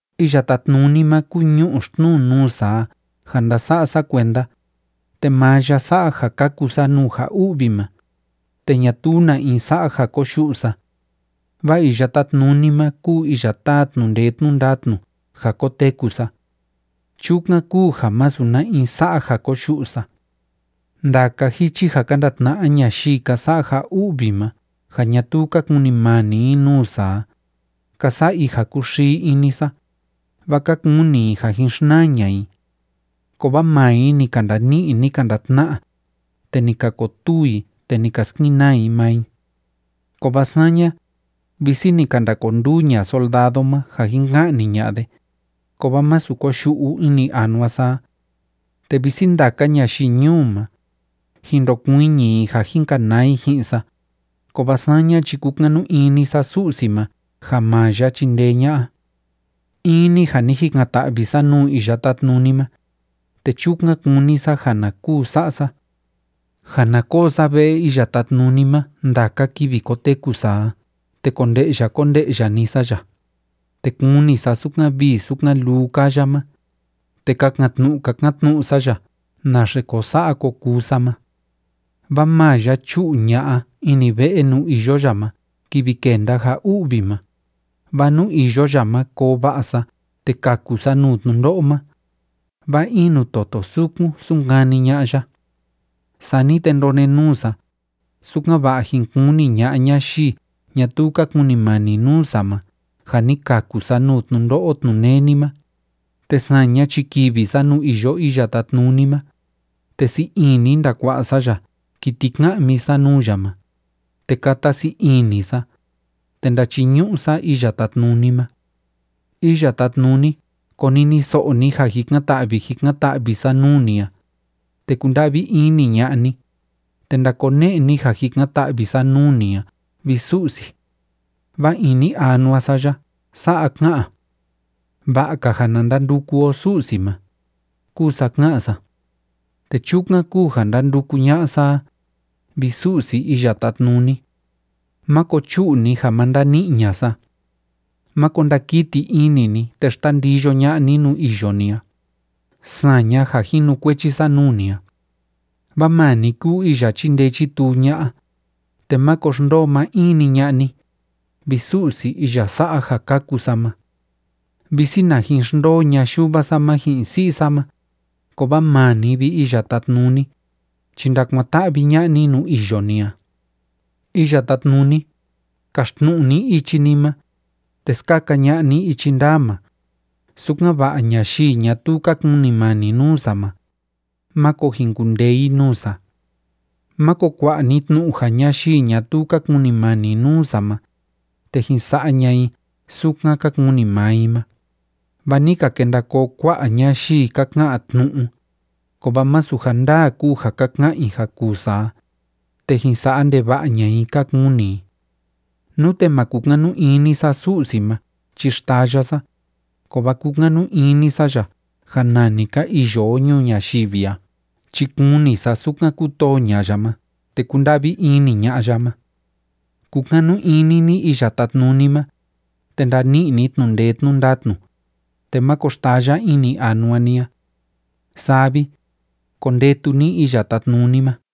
Iya Tátnuni ma kúu ñu'u xtnuu nuu sa a ja ndása'a sa kuenda, te maa ya sa'a ja kaku sa nuu ja u'vi ma, te ñatuu na in sa'a ja koyu'u sa. Vaa Iya Tátnuni ma kúu iya táa tnu'u ndee tnu'u ndatnu ja koteku sa. Chukan kúu ja masu na in sa'a ja koyu'u sa. Ndaka jichi ja ka ndatna'a ñayii ka sa'a ja u'vi ma ja ñatuu ka kunimani i nuu sa a, ka sa'a i ja kúxii ini sa, vaa ka kuni i ja jin xnaa ña'a i. Kovaa maa i ni ka ndani'i, ni ka ndatna'a, te ni ka kotuu i, te ni ka skenaa i maa i. Kovaa saña, visi ni ka ndakonduu ña'a soldado ma ja jin ka'ni ña'a de, kovaa masu koyu'u ini anua sa a. Te visi ndaka ñayii ñuu ma, jin ndokuiñi i ja jin kanaa i ji'in sa, kovaa saña chi kukanu ini sa Su'si ma ja maa ya chindee ña'a. In‑ni ja ni jikan‑ta'vi sa nuu Iya Tátnuni ma, te chukan kúni sa ja na kuu sa'a sa: Ja na koo sa ve'e Iya Tátnuni ma ndaka kivi koteku sa a, te konde'ya konde'ya‑ni sa ya, te kuni sa sukan vii sukan luu kaa ya ma, te kakan‑tnu'u kakan‑tnu'u sa ya naxe ko sa'a ko kuu sa ma. Vaa maa ya chu'u ña'a ini ve'e nuu iyo ya ma kivi kenda ja u'vi ma, vaa nuu iyo ya ma koo va'a sa te kaku sa nuu tnundo'o ma, vaa in nuu toto sukun sunkani ña'a ya. Sani te ndonenuu sa, sukan‑va'a jin kuni ña'a ñayii ñatuu ka kunimani nuu sa ma ja ni kaku sa nuu tnundo'o tnuneni ma, te saña chi kivi sa nuu iyo Iya Tátnuni ma, te sii ini ndakua'a sa ya kiti ka'mi sa nuu ya ma, te kata sii ini sa, te ndachiñu'u sa Iya Tátnuni ma. Iya Tátnuni, koniniso'o ni ja jikan‑ta'vi jikan‑ta'vi sa nuu ni a, te kunda'vi ini ña'a ni, te ndakone'e ni ja jikan‑ta'vi sa nuu ni a, vi Su'si. Vaa ini anua sa ya sa'a ká'an: “Va'a‑ka ja na ndanduku o Su'si ma”, kúu sa ká'an sa. Te chukan kúu ja ndánduku ña'a sa a, vi Su'si Iya Tátnuni. Máko chu'u ni ja ma ndani'i ña'a sa. Máko ndakiti ini ni te xtandiyo ña'a ni nuu iyo ni a, saña ja jinukuechi sa nuu ni a. Vaa maa ni kúu iya chíndee chítuu ña'a, te máko xndoo maa in‑ni ña'a ni, vi Su'si iya sa'a ja kaku sa ma. Visi na jin xndoo ña'a yuva sa ma ji'in si'i sa ma, kovaa maa ni, vi Iya Tátnuni, chi ndakuan‑ta'vi ña'a ni nuu iyo ni a. Iya Tátnuni, kaxtnu'u ni ichi ni ma, te skaka ña'a ni ichi ndaa ma, sukan‑va'a ñayii ñatuu ka kunimani nuu sa ma, máko jin kundee i nuu sa. Máko kua'a ni tnu'u ja ñayii ñatuu ka kunimani nuu sa ma, te jin sa'a ña'a i sukan ka kuni maa i ma, vaa ni ka kenda koo kua'a ñayii ka ka'an tnu'u, kovaa masu ja ndaa kúu ja ka ka'an i ja kuu sa a, te jin sa'a ndeva'a ña'a i ka kuni i. Nute ma kukanu ini sa Su'si ma chi xtaya sa, kovaa kúkanu ini sa ya ja nani ka iyo o ñuu ñayivi a chi kuni sa sukan kútoo ña'a ya ma te kúnda'vi ini ña'a ya ma. Kukanu ini ni Iya Tátnuni ma, te ndani'i ni tnu'u ndee tnu'u ndatnu, te máko xtaya ini anua ni a. Saa vi, kondetu ni Iya Tátnuni ma.